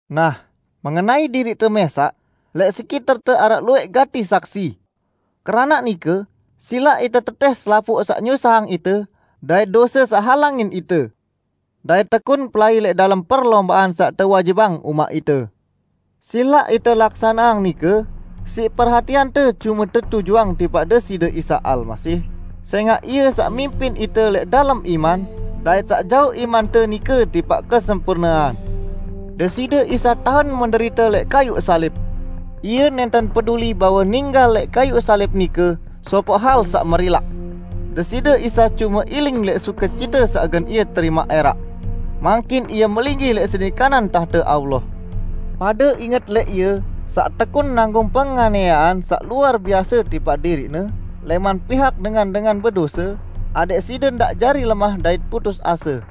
Nah, mengenai diriqte mẽsaq, lẽq sekiterte araq luwẽq gati saksi! Keranaq nike, silaq ite tetẽh selapuq saq nyusahang ite dait dose saq halangin ite. Dait tekun pelai lẽq dalem perlombaan saq tewajibang umaq ite. Silaq ite laksaneang nike siq perhatiante cume tetujuang tipaq Deside Isa Almasih, sẽngaq Ie saq mimpin ite lẽq dalem iman, dait saq jauq imante nike tipaq kesempurnean. Deside Isa tahen menderite lẽq kayuq salib! Ie nẽnten peduli bahwe ninggal lẽq kayuq salib nike sopoq hal saq merilaq. Deside Isa cume iling lẽq sukecite saq gen Ie terimaq ẽraq. Mangkin Ie melinggih lẽq sedi kanan tahte Allah. Pade inget lẽq Ie saq tekun nanggung penganiayean saq luar biase tipaq diriq-Ne lẽman pihak dengan-dengan bedose, adẽq side ndaq jari lemah dait putus ase.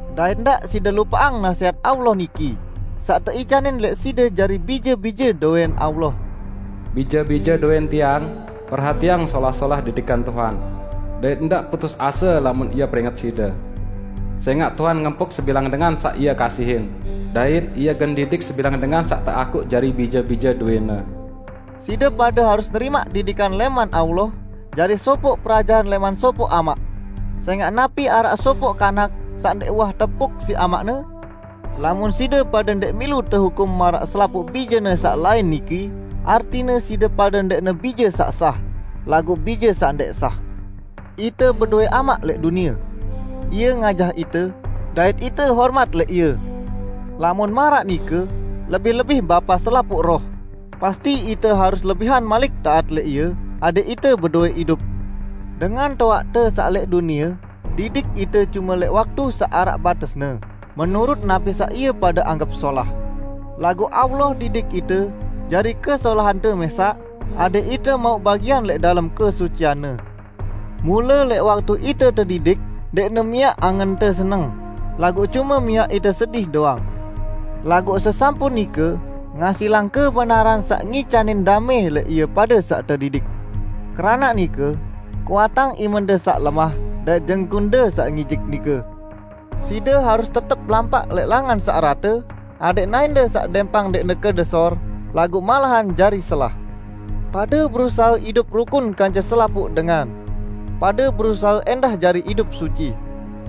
Dait ndaq side lupaqang nasẽhat Allah niki, saq teicanin lẽq side jari bije-bije dowẽn Allah: "Bije-bije dowẽn Tiang, perhatiang solah-solah didikan Tuhan, dait ndaq putus ase lamun Ie peringet side. Sẽngaq Tuhan ngempuk sebilang dengan saq Ie kasihin, dait Ie gen didik sebilang dengan saq teakuq jari bije-bije dowẽ-Ne." Side pade harus nerimaq didikan lẽman Allah jari sopoq perajahan lẽman sopoq amaq. Sẽngaq napi araq sopoq kanak saq ndẽq uwah tempuk siq amaqne? Lamun side pade ndẽq milu tehukum maraq selapuq bijene saq lain niki artine side pade ndẽqne bije saq sah, laguq bije saq ndẽq sah. Ite bedowẽ amaq lẽq dunie. Ie ngajah ite, dait ite hormat lẽq ie. Lamun maraq nike, lebih-lebih Bapa selapuq roh, pasti ite harus lebihan malik taat lẽq Ie adẽq ite bedowẽ idup. Dengan toaqte saq lẽq dunie didik ite cume lẽq waktu saq araq batesne, menurut napi saq ie pade anggep solah. Laguq Allah didik ite jari kesolahante mẽsaq, adẽq ite mauq bagian lẽq dalem kesucian-Ne. Mule lẽq waktu ite tedidik ndẽqne miaq angente seneng, laguq cume miaq ite sedih doang. Laguq sesampun nike ngasilang kebenaran saq ngicanin damẽ lẽq ie pade saq tedidik. Keranaq nike, kuatang imende saq lemah dait jengkunde saq ngijik nike! Side harus tetep lampaq lẽq langan saq rate, adẽq naẽnde saq dẽmpang ndẽqne kedesor, laguq malahan jari selah. Pade berusahe idup rukun kance selapuq dengan. Pade berusahe ẽndah jari idup suci.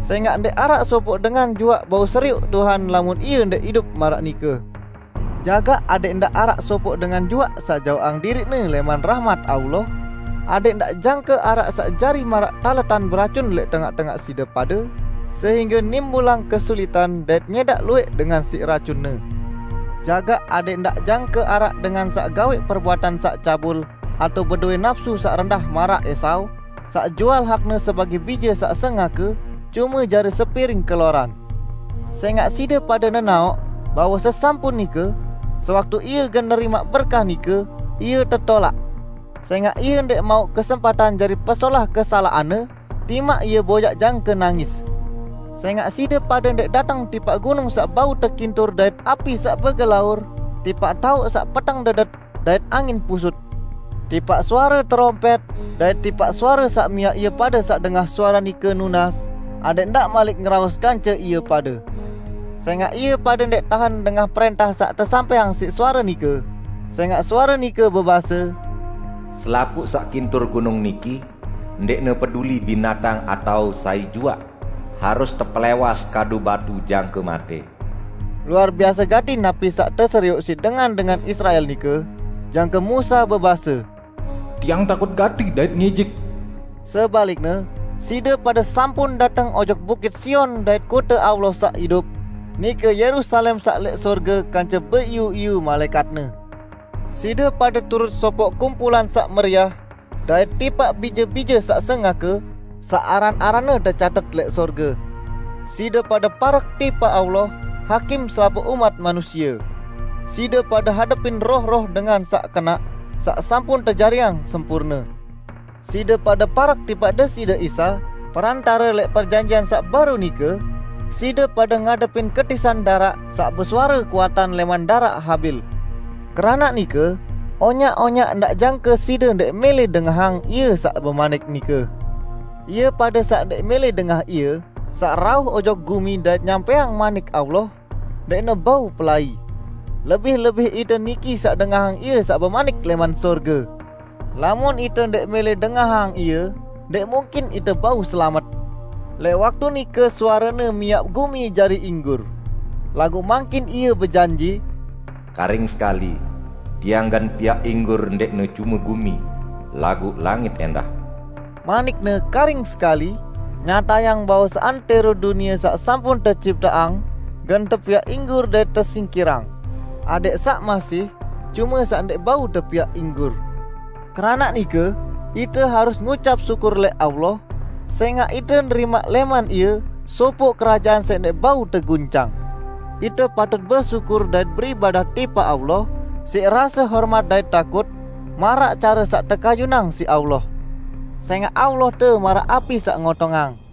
Sẽngaq ndẽq araq sopoq dengan juaq bau serioq Tuhan lamun ie ndẽq idup maraq nike. Jagaq adẽq ndaq araq sopoq dengan juaq saq jaoqang diriqne lẽman rahmat Allah, adẽq ndaq jangke araq saq jari maraq taletan beracun lẽq tengaq-tengaq side pade sehingge nimbulang kesulitan dait nyẽdaq luwẽq dengan siq racunne. Jagaq adẽq ndaq jangke araq dengan saq gawẽq perbuatan saq cabul atao bedowẽ napsu saq rendah maraq Esau, saq jual hakne sebagẽ bije saq sengake, cume jari sepiring keloran. Sẽngaq side pade nenaoq, bahwe sesampun nike, sewaktu ie gen nerimaq berkah nike ie tetolaq, sẽngaq ie ndẽq mauq kesempatan jari pesolah kesalaqanne, timaq ie boyaq jangke nangis. Sẽngaq side pade ndẽq dateng tipaq gunung saq bau tekintur dait api saq begelaur, tipaq taoq saq peteng dedet, dait angin pusut; tipaq suare terompẽt, dait tipaq suare saq miaq ie pade saq dengah suare nike nunas, adẽq ndaq malik ngeraos kance ie pade. Sẽngaq ie pade ndẽq tahen dengah prẽntah saq tesampẽang siq suare nike. Sẽngaq suare nike bebase, "Selapuq saq kintur gunung niki, ndẽqne peduli binatang atao sai juaq, harus tepelẽwas kadu batu jangke matẽ." Luar biase gati napi saq teserioq siq dengan-dengan Israel nike jangke Musa bebase, "Tiang takut gati dait ngijik!" Sebalikne, side pade sampun dateng ojok bukit Sion dait kote Allah saq idup, nike Yerusalem saq lẽq sorge kance beiyu-iyu malaẽkatne. Side pade turut sopoq kumpulan saq meriah -- dait tipaq bije-bije saq sengake, saq aran-aranne tecatet lẽq sorge. Side pade parek tipaq Allah, Hakim selapuq umat manusie. Side pade hadepin roh-roh dengan saq kenaq, saq sampun tejariang sempurne. Side pade parek tipaq Deside Isa, Perantare lẽq perjanjian saq baru nike; side pade ngadepin ketisan daraq saq besuare kuatan lẽman daraq Habil. Keranaq nike, onyaq-onyaq ndaq jangke side ndẽq mẽlẽ dengahang Ie saq bemanik nike. Ie pade saq ndẽq mẽlẽ dengah Ie saq rauh ojok gumi dait nyampẽang Manik Allah, ndẽqne bau pelai. Lebih-lebih ite niki saq dengahang Ie saq bemanik lẽman sorge! Lamun ite ndẽq mẽlẽ dengahang Ie, ndẽq mungkin ite bau selamet! Lẽq waktu nike suare-Ne miaq gumi jari inggur. Laguq mangkin Ie bejanji, "Karing sekali, Tiang gen piaq inggur ndẽqne cume gumi, laguq langit ẽndah." Manik-Ne "karing sekali" nyatayang bahwe seantẽro dunie saq sampun tecipteang gen tepiaq inggur dait tesingkirang, adẽq saq masih cume saq ndẽq bau tepiaq inggur. Keranaq nike, ite harus ngucap syukur lẽq Allah, sẽngaq ite nerimaq lẽman Ie sopoq kerajaan saq ndẽq bau teguncang. Ite patut besyukur dait beribadah tipaq Allah siq rase hormat dait takut, maraq care saq tekayunang siq Allah. Sẽngaq Allahte maraq api saq ngotongang.